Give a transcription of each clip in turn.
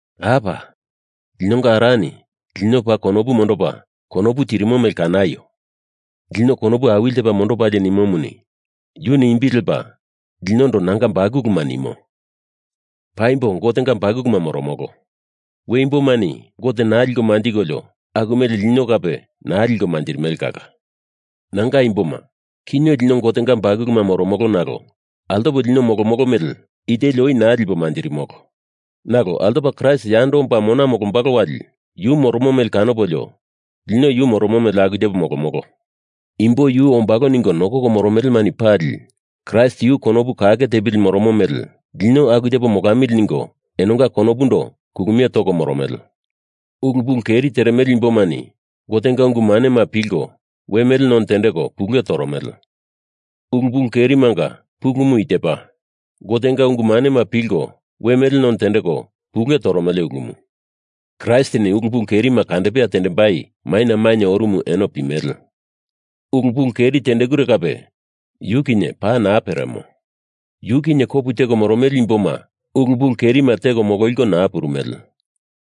Apa! Linonga Arani lino paa konopu mondopa konopu tirimo mele kanaio! Lino konopu awili tepa mondopalie nimomuni yuni imbi lepa linondo nanga bakuluma nimo. Paimbo Gotenga bakuluma moromolo. We imbomani Gote naa liko manjikolio aku mele lino kape naa liko manjirimele kala. Nanga imboma, kinye lino Gotenga bakuluma moromolo nalo altopo lino molomolo mele iteli oi naa lipo manjirimolo. Nalo altopa Kraist yando omba mona molombalo wali yu moromo mele kanopolio, lino yu moromo mele aku tepo molomolo. Imbo Yu ombalo ningo nokoko moromelemani pali Kraist yu konopu kake tepili moromo mele lino aku tepo molamili ningo enonga konopundo kulumie toko moromele. Ulu pulu keri teremele imbomani Gotenga ungu manema pilko we mele none tendeko pule toromele. Ulu pulu kerimanga pulumu i tepa: Gotenga ungu manema pilko we mele none tendeko pule toromele ulumu. Kraistini ulu pulu kerima kandepea tendembai maina mainye orumu eno pimele. Ulu pulu keri tendekure kape yu kinye paa naa peremo. Yu kinye kopu teko moromele imboma ulu pulu kerima teko mololiko naa purumele.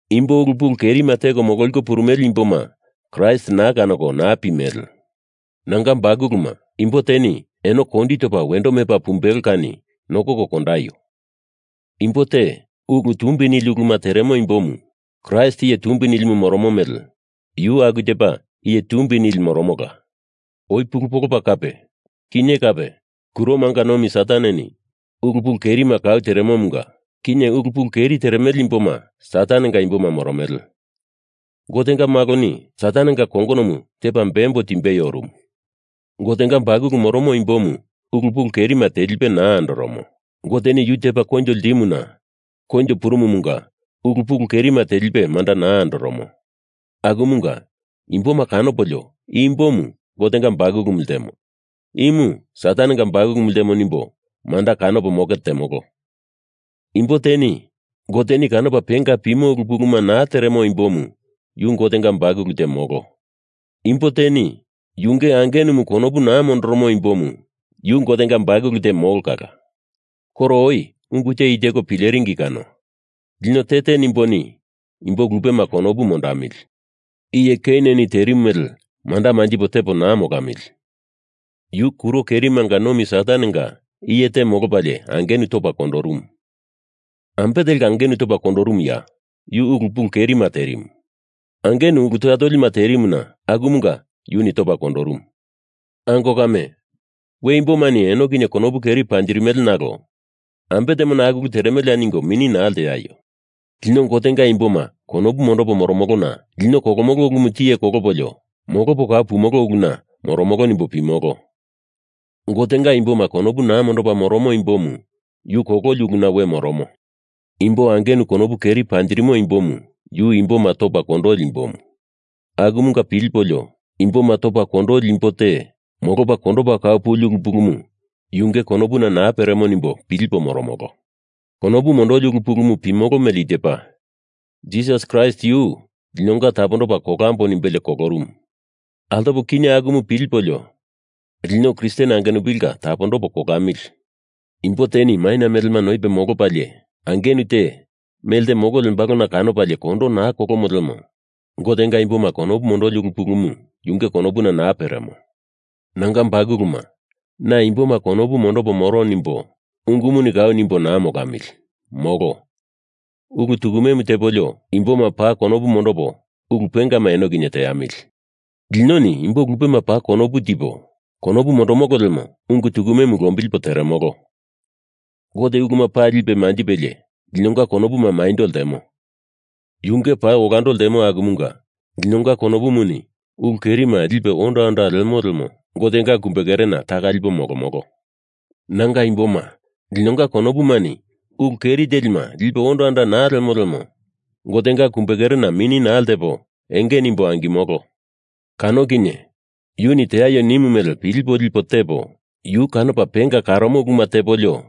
Imbo ulu pulu kerima teko mololiko purumele imboma Kraist naa kanoko naa pimele. Nanga bakuluma, imbo teni eno kondi topa wendo mepa pumbelo kani nokoko kondaio! Imbo te ulu tumbi nili uluma teremo imbomu Kraist Iye Tumbi Nilimu moromo mele yu aku tepa iye tumbi nili moromola. Oi pulu polopa kape, kinye kape kuromanga nomi Sataneni ulu pulu kerima kau teremomunga kinye ulu pulu keri teremele imboma Satanenga imboma moromele. Gotenga Maloni Satanenga kongonomu tepa bembo timbei orumu. Gotenga bakulu moromo imbomu ulu pulu kerima telipe naa andoromo. Goteni yu tepa koinjo ltimuna koinjo purumumunga ulu pulu kerima telipe manda naa andoromo. Akumunga imboma kanopolio i imbomu Gotenga bakulumu ltemo, imu Satanenga bakulumu ltemo nimbo manda kanopo moke temolo. Imbo teni Goteni kanopa penga pimo ulu puluma naa teremo imbomu yu Gotenga bakulu te molo. Imbo teni yunge angenumu konopu naa mondoromo imbomu yu Gotenga bakulu te molo kala. Koro oi ungu te i teko pileringi kano. Lino te te nimboni imbo lupema konopu mondamili. Iye Keineni terimu mele manda manjipo tepo naa molamili! Yu kuro kerimanga nomi Satanenga iye te molopalie angenu topa kondorumu. Ambe telka angenu topa kondorumuya? Yu ulu pulu kerima terimu. Angenu ulu toya tolima terimuna akumunga yuni topa kondorumu. Ango kame, we imbomani eno kinye konopu keri panjirimele nalo ambe temona aku ulu teremeleya ningo mini naa lteaio! Lino Gotenga imboma konopu mondopo moromolona lino kolomolo ulumu tiye kolopolio, molopo kau pumolo uluna moromolo nimbo pimolo. Gotenga imboma konopu naa mondopa moromo imbomu yu kololi uluna we moromo. Imbo angenu konopu keri panjirimo imbomu yu imboma topa kondoli imbomu. Akumunga pilipolio imboma topa kondoli imbo te molopa kondopa kau puli ulu pulumu yunge konopuna naa peremo nimbo pilipo moromolo. Konopu mondoli ulu pulumu pimolo mele i tepa: Jisas Kraist yu linonga tapondopo kolambo nimbelie kolorumu. Altopo kinye akumu pilipolio lino Kristen angenupilinga tapondopo kolamili! Imbo teni maina melema noipe molopalie angenu te melte molo lembalona kanopalie kondo naa kolomo lemo Gotenga imboma konopu mondoli ulu pulumu yunge konopuna naa peremo. Nanga bakuluma, na imboma konopu mondopo moro nimbo ungumuni kau nimbo naa molamili, molo! Ulu tukumemu tepolio, imboma paa konopu mondopo ulu pengama eno kinye teamili. Linoni imbo lupema paa konopu tipo konopu mondomolo lemo ungu tukumemu lombilipo teremolo. Gote uluma pali lipe manjipelie linonga konopumu maindo ltemo, yunge paa olando ltemo akumunga linonga konopumuni ulu kerima lipe onda onda lemo lemo Gotenga kumbekerena taka lipo molomolo. Nanga imboma linonga konopumani ulu keri telima lipe onda onda naa lemo lemo Gotenga kumbe kerena mini naa ltepo enge nimbo angimolo. Kano kinye, yuni teaio nimu mele pilipo lipo tepo, yu kanopa penga karomo uluma tepolio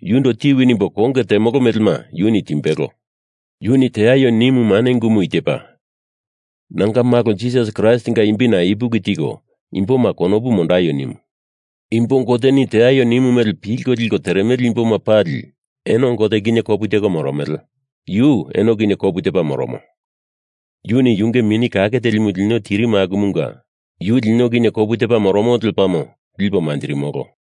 yundo tiwi nimbo konge temolo melema yuni timbelo. Yuni teaio nimu mane ungumu i tepa: Nanga Malo Jisas Kraistinga imbina ipuki tiko imboma konopu mondaio nimu. Imbo Goteni teaio nimu mele pilko liko teremele imboma pali eno Gote kinye kopu teko moromele, yu eno kinye kopu tepa moromo. Yuni yunge Mini Kake Telimu lino tirimu akumunga yu lino kinye kopu tepa moromo lepamo lipo manjirimolo.